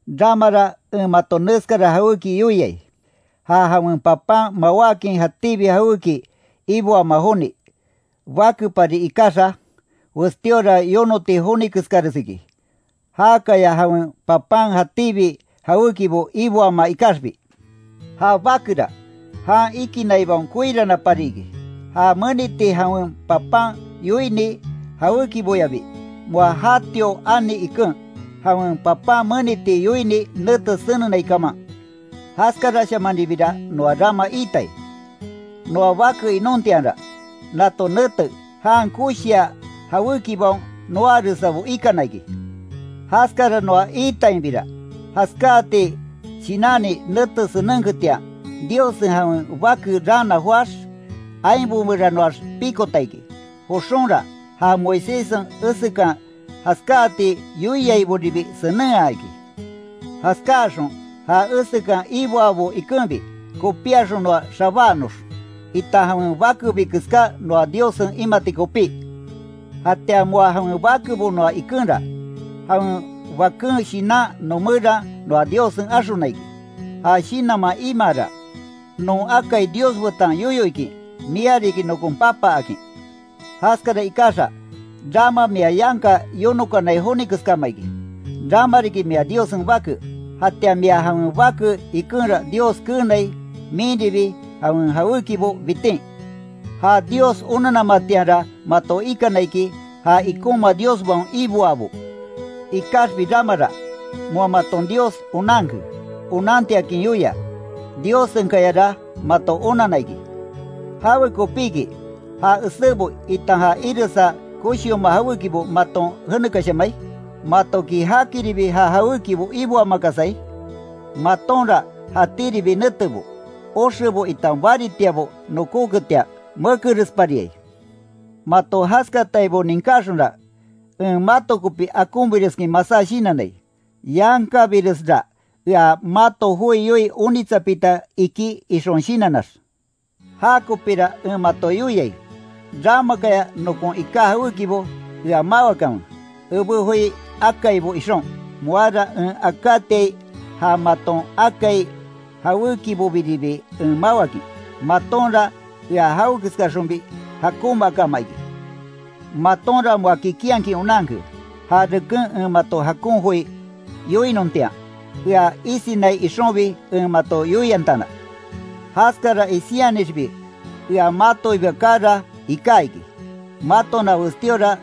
Ramara en mato neskara jawéki yoiai: Ja jawen papan mawákin jatíbi jawéki iboamaa joni, bakepari ikaxa, westíora yonoti joni keskares iki, jakaya jawen papan jatíbi jawékibo iboamaa ikaxbi. Ja bakera jan ikinaibaon koiranapari iki, ja meniti jawen papan yoini jawékiboyabi, moa jatio ani iken, jawen papan meniti yoini nete senenai kaman. Jaskarashamanribira noa rama iitai. Noa bake inontianra, nato nete jan koshia jawékibaon noaaresabo ikana iki. Jaskara noa iitainbira, jaskáati shinanni nete senenketian, Diossen jawen Bake raana joáx, ainbo meranoax pikota iki. Joxonra, ja Moiséssen esekan jaskáati yoiaiboribi senenhaa iki. Jaskáaxon ja esekan iboabo ikenbi, kopíaxon noa xabáanox, itan jawen bakebi keská noa Diossen imati kopí. Jatian moa jawen bakebo noa ikenra, jawen Baken Shinan noomeran noa Diossen axona iki. Ja shinanman imaara, non akai Dios betan yoyo ikin: “Mia riki nokon Papa”, akin. Jaskara ikaxa, rama mia yanka yonokanai joni keskama iki. Rama riki mia Diossen bake. Jatian mia jawen bake ikenra Dios keenai, minribi jawen jawékibo bitin. Ja Dios onanamatianra mato ikana iki, ja ikonma diosbaon iboaabo. Ikaxbi ramara, moa maton Dios onanke, onantiakin yoia, Diossenkayara mato onanna iki ¿Jawekopiki, ja esébo, itan ja iresa koshioma jawékibo maton jenekashamai? ¿Matoki jakiribi ja jawékibo iboamakasai? Matonra jatíribi netebo, oxebo itan baritiabo nokóketian, mekerespariai. Mato jaskataibo ninkáxonra, en mato kopi akonbireskin masá shinannai, yankabiresra ea mato joi yoii onitsapita iki ixon shinannax. Ja kopira en mato yoiai: Ramakaya nokon iká jawékibo ea mawakanwe, ebé joi akaibo ixon. Moara en akátiai ja maton akai jawékibobiribi en mawakin. Matonra ea jawekeskaxonbi jakonmaakama iki. Matonra moa kikinhakin onanke, ja reken en mato jakon joi yoinontian, ea isinai ixonbi en mato yoiantana. Jaskara isinyanixbi ea matoiba kaara iká iki, matona westíora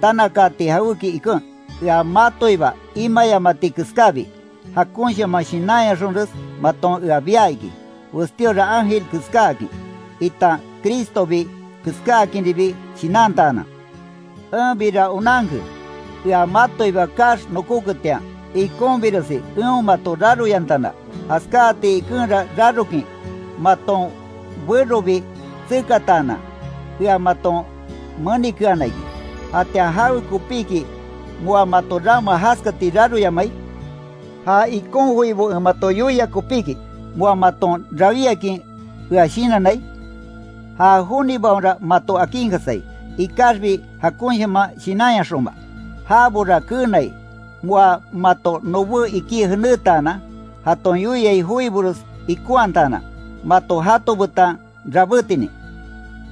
tanakaati jawéki iken, ea matoiba imayamati keskábi, jakonshaman shinanyaxonres maton ea bia iki, westíora ángel keskáakin, itan Cristobi keskáakinribi shinantaanan. Enbira onanke ea matoiba kaax nokoketian, ikonbiresi eon mato raroyantana. Jaskáati ikenra rarokin maton berobi tsekataanan, ea maton menikeana iki ¿Jatian jawekopiki moa mato rama jaskati raroyamai? ¿Ja ikon joibo en mato yoia kopíki, moa maton rawíakin ea shinannai? Ja jonibaonra mato akinkasai, ikaxbi jakonshaman shinanyaxonma. Jabora keenai, moa mato nobé ikí jenétaanan, jaton yoiai joibores ikonhataanan, mato jato betan rabétinin.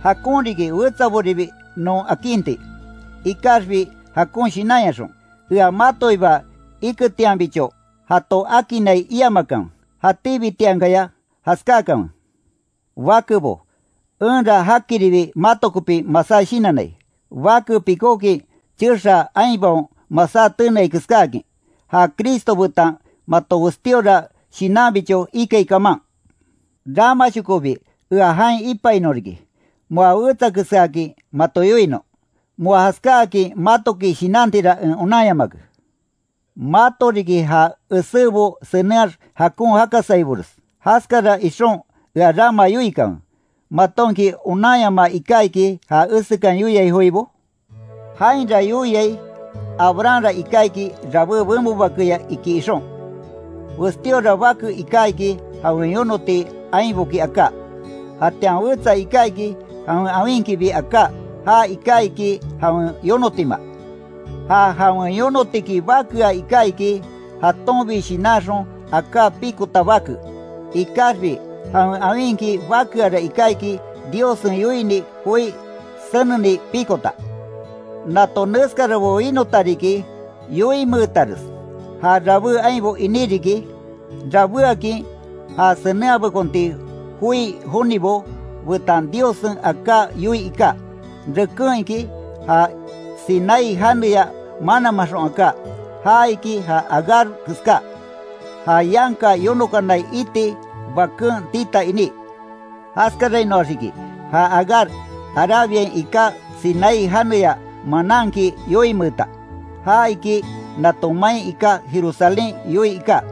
Jakon riki wetsaboribi non akinti, ikaxbi jakon shinanyaxon. Ea matoiba iketianbicho jato akinnai iamakanwe, jatíbitiankaya jaskákanwe. Bakebo, enra jakiribi mato kopi masá shinannai. Bake pikókin chexaa ainbaon masá teneai keskáakin, ja Cristo betan mato westíora shinanbicho ikai kaman. ¡Ramashokobi ea jain ipainon riki, moa wetsa keskaakin mato yoinon. Moa jaskáakin matoki shinanmatira en onanyamake! Mato riki ja esébo senenhaax jakon jakasaibores. Jaskara ixon ea rama yoikanwe: ¿Matonki onanyama iká iki ja esekan yoiai joibo? Jainra yoiai Abrahamra iká iki rabé benbo bakeya iki ixon: Westíora bake iká iki jawen yonoti ainboki aká, jatian wetsa iká iki, jawen awinkibi aká ja iká iki jawen yonotima. Ja jawen yonotiki bakea iká iki, jatonbi shinanxon aká pikota bake. Ikaxbi jawen awinki bakeara iká iki, Diossen yoini joi seneni pikota. Nato neskarabo winota riki, yoinmeetares. Ja rabé ainbo iní riki, rabéakin ja senenhabekonti joi jonibo betan Diossen aká yoii iká. Reken iki, ja Sinaí janeya mananmanxon aká, ja iki ja Agar keska, ja yanka yonokanai iti baken tita iní. Jaskarainoax iki, ja Agar Arabiain iká Sinaí janeya mananki yoinmeeta. Ja iki nato main iká Jerusalén yoii iká.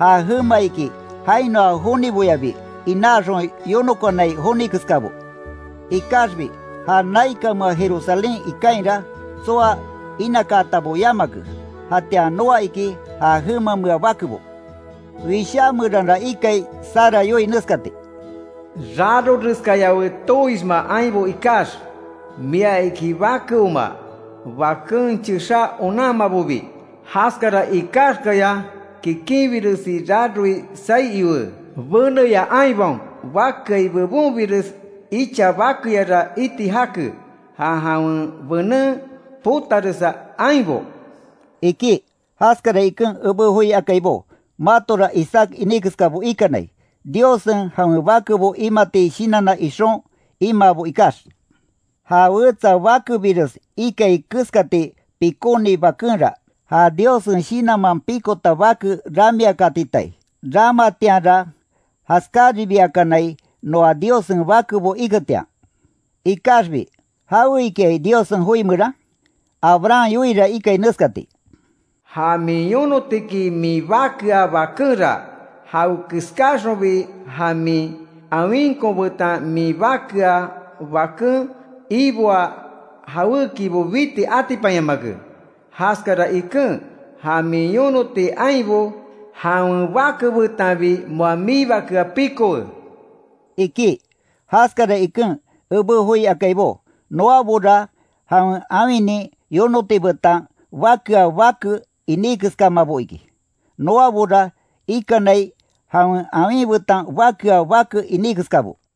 Ja jema iki, jainoa joniboyabi, inaaxon yonokanai joni keskabo. Ikaxbi ja naikanmea Jerusalén ikainra, tsoa inakaatabo yamake. Jatian noa iki, ja jemamea bakebo. Wishá meranra ikai Sara yoii neskati: “Raroreskayawe, tooisma ainbo ikax, mia iki bakeoma, baken chexá onanmabobi. Jaskara ikaxkaya kikinbiresi raroi saí iwe. Beneya ainbaon bakeai bebonbires icha bakeyara iti jake, ja jawen benen potaresa ainbo”, iki. Jaskara iken ebé joi akaibó, matora Isaac iní keskabo ikanai, Diossen jawen bakebo imati shinanna ixon imaabo ikax. Ja wetsa bakebires ikai keskati pikóni bakenra, ja Diossen Shinanman pikota bake ramiakatitai. Ramatianra jaskáribiakanai, noa Diossen bakebo iketian. Ikaxbi ¿Jawe ikiai Diossen joi meran? Abraham yoiira ikai neskati: “Ja min yonotiki min bakea bakenra, jawekeskaxonbi, ja min awinkon betan min bakeaa baken iboa jawékibo biti atipanyamake. Jaskara iken ja min yonoti ainbo, jawen bake betanbi moa miibakea pikowe”, iki. Jaskara iken ebé joi akaibó, noabora jawen awinin yonoti betan bakeaa bake iní keskamabo iki. Noabora ikanai, jawen awin betan bakea bake iní keskabo.